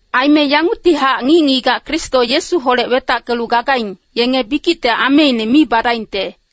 Aime yanguctihac ngic-ngigac Kristo Yesuholec wetackelu gagaing, yenge bikicte ameine mi badaingte.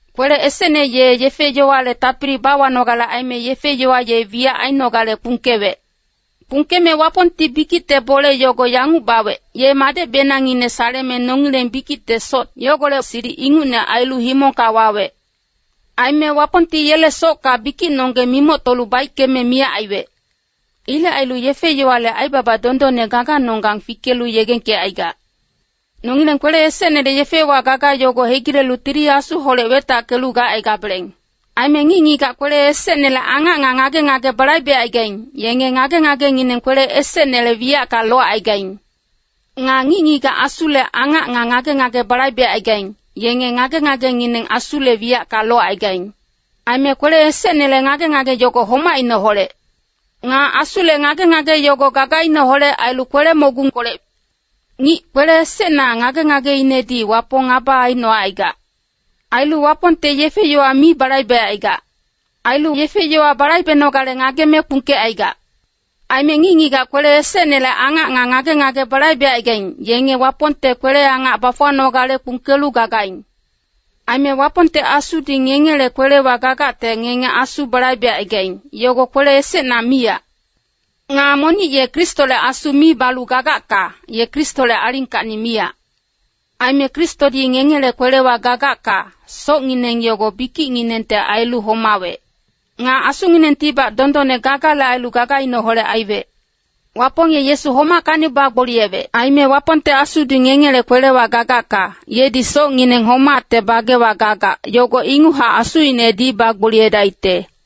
Kwele esecne ye yefe-yowale tapili bawanogale aime yefe-yowa ye wiyac ainogale kpungkewec. Kpungkeme Wapongti bikicte bole yogo yanguc bawec, ye Madecbenangngine saleme nongileng bikicte soc yogolec silic ingucne ailu himongka wawec. Aime Wapongti yele socka bikicnonggeng mimoctolu baickeme miyac aiwec. Ilec ailu yefe-yowale aibaba dondonne gaganonggang fikelu yegengkecaigac. Nongileng kwele esecnele yefewa gaga yogo hegilelu Tili Asuholec wetackelu gacaigabeleng. Aime ngic-ngigac kwele esecnele angac nga ngage-ngage balaibecaigaing, yenge ngage-ngagengineng kwele esecnele wiyacka locaigaing. Nga ngic-ngigac Asule angac nga ngage-ngage balaibecaigaing, yenge ngage-ngagengineng Asule wiyacka locaigaing. Aime kwele esecnele ngage-ngage yogo homacineholec. Nga Asule ngage-ngage yogo gagaineholec ailu kwele-mogungkolec. Ngic kwele esecna ngage-ngageinedi Wapong ngaba aicnocaigac. Ailu Wapongte yefe-yowa mi balaibecaigac. Ailu yefe-yowa balaibenogale ngageme kpungkecaigac. Aime ngic-ngigac kwele esecnele angac nga ngage-ngage balaibecaigaing, yenge Wapongte kwele-angac bafuwanogale kpungkelu gagaing. Aime Wapongte Asudi ngengele kwelewa gagacte ngenge Asu balaibecaigaing, yogo kwele esecna miyac. Nga monic ye Kristole Asu mi balu gagacka, ye Kristole alingkacni miyac. Aime Kristodi ngengele kwelewa gagacka, socngineng yogo bikicnginengte ailu homawec. Nga asunginengtibac dondonne gagale ailu gagaineholec aiwec. Wapong ye Yesu homackacni bagboliyewec. Aime Wapongte Asudi ngengele kwelewa gagacka, yedi socngineng homacte bagewa gagac, yogo inguchac Asuinedi bagboliyedaicte.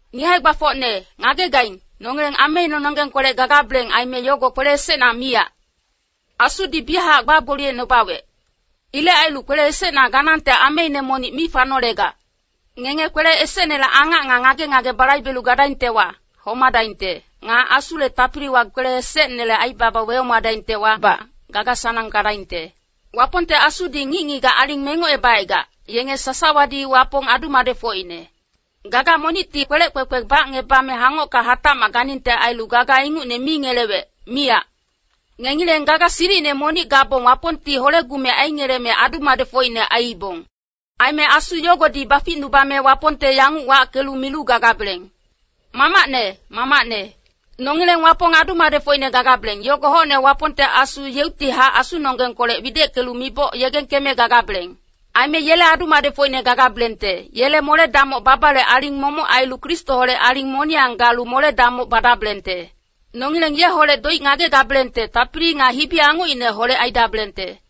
Ngic hae-gbafocne, ngagegaing, nongileng ameinenonggengkolec gagabeleng aime yogo kwele esecna miyac. Asudi biyachac bagboliyecnubawec. Ilec ailu kwele esecna ganangte ameine monic mi fanolegac. Ngenge kwele esecnele angac nga ngage-ngage balaibelu gadaingtewa, homadaingte. Nga Asule tapiliwa kwele esecnele aibaba wehomadaingtewabac, gaga-sanang gadaingte. Wapongte Asudi ngic-ngigac aling mengocebacaigac, yenge sasawadi Wapong adu-madecfocine. Gaga monicti kwelec kwekwe bacngebame hangocka hatacmac ganingte ailu gaga ingucne mi ngelewec, miyac. Ngengileng gaga silicine monic gabong Wapongti hole-gumec aingeleme adu-madecfocine aiibong. Aime Asu yogodi baficnubame Wapongte yanguc wackelu milu gagabeleng, “Mamacne, Mamacne.” Nongileng Wapong adu-madecfocine gagabeleng, yogo hocne Wapongte Asu yeuctihac asunonggengkolec wideckelu miboc yegengkeme gagabeleng. Aime yele adu-madecfocine gagabelengte, yele mole-damoc babale aling momoc ailu Kristoholec aling moniyang galu mole-damoc badabelengte. Nongileng yeholec doic ngagegabelengte tapili nga hibi-angocineholec aidabelengte.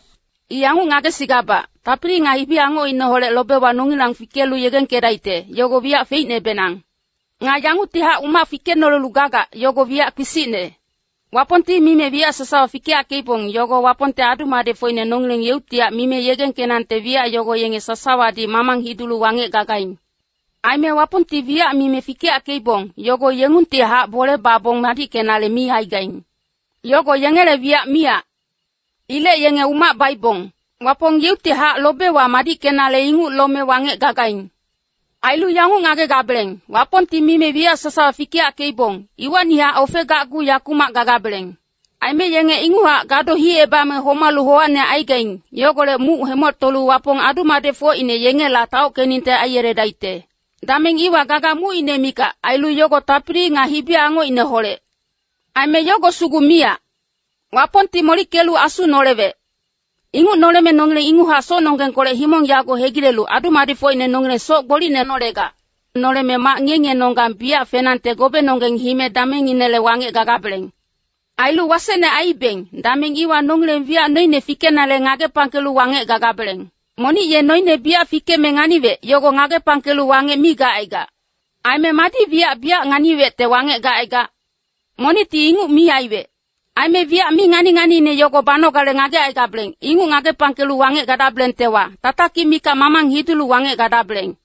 I yanguc ngagesigabac, tapili nga hibi-angocineholec lobewa nongilang fikelu yegengkedaicte, yogo wiyac feicnebenang. Nga yanguctihac umac fikenolelu gagac, yogo wiyac kpisicne. Wapongti mime wiyac sasawa fikeyackeibong, yogo Wapongte adu-madecfocine nongileng yeuctihac mime yegengkenangte wiyac yogo yenge sasawadi mamang hidulu wangec gagaing. Aime Wapongti wiyac mime fikeyackeibong, yogo yengungtihac bole babong madickenale mi aigaing. Yogo yengele wiyac miyac. Ilec yenge umac baibong. Wapong yeuctihac lobewa madickenale inguc lome wangec gagaing. Ailu yanguc ngagegabeleng, Wapongti mime wiyac sasawa fikeyackeibong, iwacnihac ofegacgu yakumac gagabeleng. Aime yenge inguchac gado hicebame homalu howacine aigaing, yogolec muc hemoctolu Wapong adu-madecfocine yengela taockeningte aiyeledaicte. Dameng iwa gaga mucine mikac, ailu yogo tapili nga hibi-angocineholec. Aime yogo sugu miyac. Wapongti molickelu Asu nolewec. Inguc noleme nongileng inguchac socnonggengkolec himong yago hegilelu, adu-madecfocine nongileng soc gbolicne nolegac. Noleme mac ngiye-ngiyenonggang biyac fenangte gobenonggeng hime damengnginele wangec gagabeleng. Ailu wasecne aiibeng, dameng iwa nongileng wiyac noine fikenale ngagepangkelu wangec gagabeleng. Monic ye noine biyac fikeme nganiwec, yogo ngagepangkelu wangec mi gacaigac. Aime madi wiyac biyac nganiwecte wangec gacaigac? Monicti inguc mi aiwec. Aime wiyac mi ngani-nganiine yogo banogale ngagecaigabeleng, inguc ngagepangkelu wangec gadabelengtewa, tatakic mikac mamang hidulu wangec gadabeleng.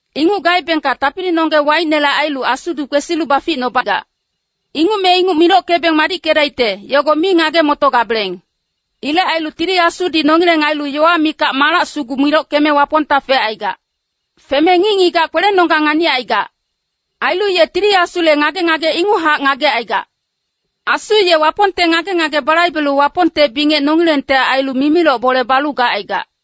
Inguc gaebengka tapilinonggeng waicnele ailu Asudi kwesilu baficnubagac. Inguc me inguc milockebeng madickedaicte, yogo mi ngage-motogabeleng. Ilec ailu Tili Asudi nongileng ailu yowa mikac malac sugu milockeme Wapongta fecaigac. Feme ngic-ngigac kwelenonggeng nganicaigac. Ailu ye Tili Asule ngage-ngage inguchac ngagecaigac. Asu ye Wapongte ngage-ngage balaibelu Wapongte bingec nongilengte ailu mimiloc bole balu gacaigac.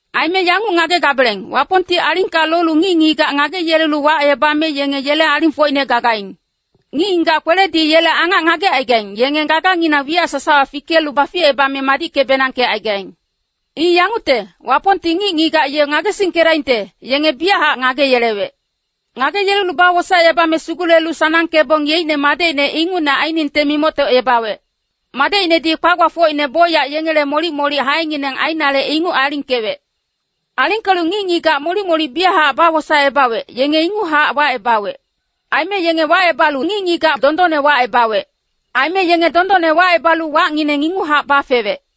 Aime yanguc ngagegabeleng, Wapongti alingka lolu ngic-ngigac ngageyelelu wacebame yenge yele alingfocine gagaing. Ngic-ngigac kweledi yele angac ngagecaigaing, yenge gaganginang wiyac sasawa fikelu baficebame madicke-benangkecaigaing. I yangucte, Wapongti ngic-ngigac ye ngagesingkedaingte, yenge biyachac ngageyelewec. Ngageyelelu bawosaecebame sugulelu sanangkebong yeicne Madecine ingucne ainingte mimoctocebawec. Madecinedi kwa-gbafocine bocyac yengele molic-molic haengineng ainale inguc alingkewec. Alingkelu ngic-ngigac molic-molic biyachac bawosaecebawec, yenge inguchac wacebawec. Aime yenge wacebalu ngic-ngigac dondonne wacebawec. Aime yenge dondonne wacebalu wacngineng inguchac bafewec.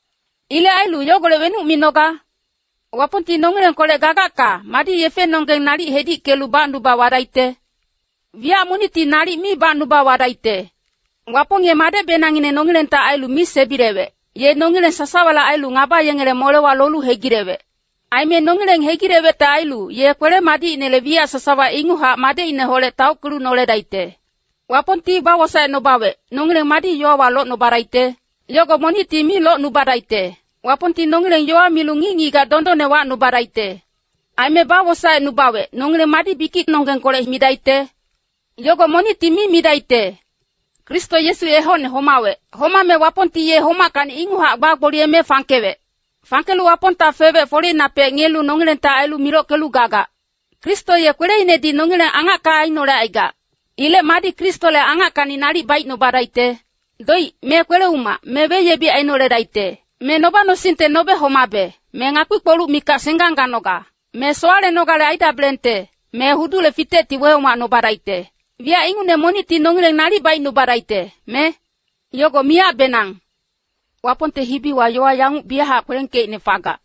Ilec ailu yogolec wenuc minoga? Wapongti nongilengkolec gagacka, madi yefenonggeng nalic hedickelu bacnuba wadaicte? Wiyac monicti nalic mi bacnuba wadaicte. Wapong ye Madecbenangngine nongilengte ailu mi sebilewec, ye nongileng sasawale ailu ngaba yengele molewa lolu hegilewec. Aime nongileng hegilewecte ailu, ye kwele-madicinele wiyac sasawa inguchac Madecineholec taockelu noledaicte. Wapongti bawosaecnubawec, nongileng madi yowawa locnubadaicte? Yogo monicti mi locnubadaicte. Wapongti nongileng yowa milu ngic-ngigac dondonne wacnubadaicte. Aime bawosaecnubawec, nongileng madi bikicnonggengkolec midaicte? Yogo monicti mi midaicte. Kristo Yesu ye hocne homawec. Homame Wapongti ye homackacni inguchac bagboliyeme fangkewec. Fangkelu Wapongta fewec foleinapec ngiyelu nongilengte ailu milockelu gagac. Kristo ye kweleinedi nongileng angacka ainolecaigac. Ilec madi Kristole angackacni nalic baicnubadaicte? Doic, me kwele-umac, me weyebic ainoledaicte. Me noba-nosingte nobe homabe, me ngakpi-kpoluc mikac senggang ganoga. Me sowalenogale aidabelengte, me hudule fitecti wehomacnubadaicte. Wiyac ingucne monicti nongileng nalic baicnubadaicte, me? Yogo miyacbenang. Wapongte hibiwa yowa yanguc biyachac kwelengkeicne fagac,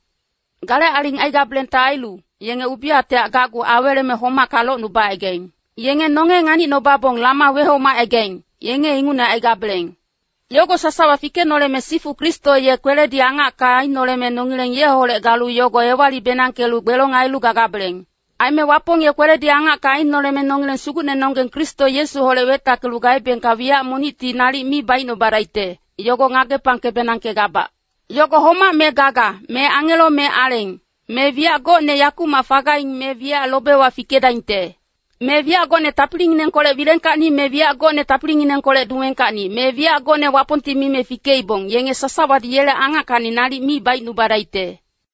“Gale aling aigabelengte ailu, yenge ubiyactehac gacgu aweleme homacka locnubacaigaing. Yenge nonge nganicnubabong lama wehomacaigaing, yenge ingucne aigabeleng.” Yogo sasawa fikenoleme sifu Kristo ye kweledi angacka ainoleme nongileng yeholec galu yogo ewali-benangkelu gbelong ailu gagabeleng. Aime Wapong ye kweledi angacka ainoleme nongileng Sugucnenonggeng Kristo Yesuholec wetackelu gaebengka wiyac monicti nalic mi baicnubadaicte, yogo ngagepangke-benangkegabac. Yogo homac me gaga, me angelo me aleng, me wiyac gocne yakumac fagaing me wiyac lobewa fikedaingte. Me wiyac gocne tapilinginengkolec wilengkacni me wiyac gocne tapilinginengkolec dumengkacni. Me wiyac gocne Wapongti mime fikeibong, yenge sasawadi yele angackacni nalic mi baicnubadaicte.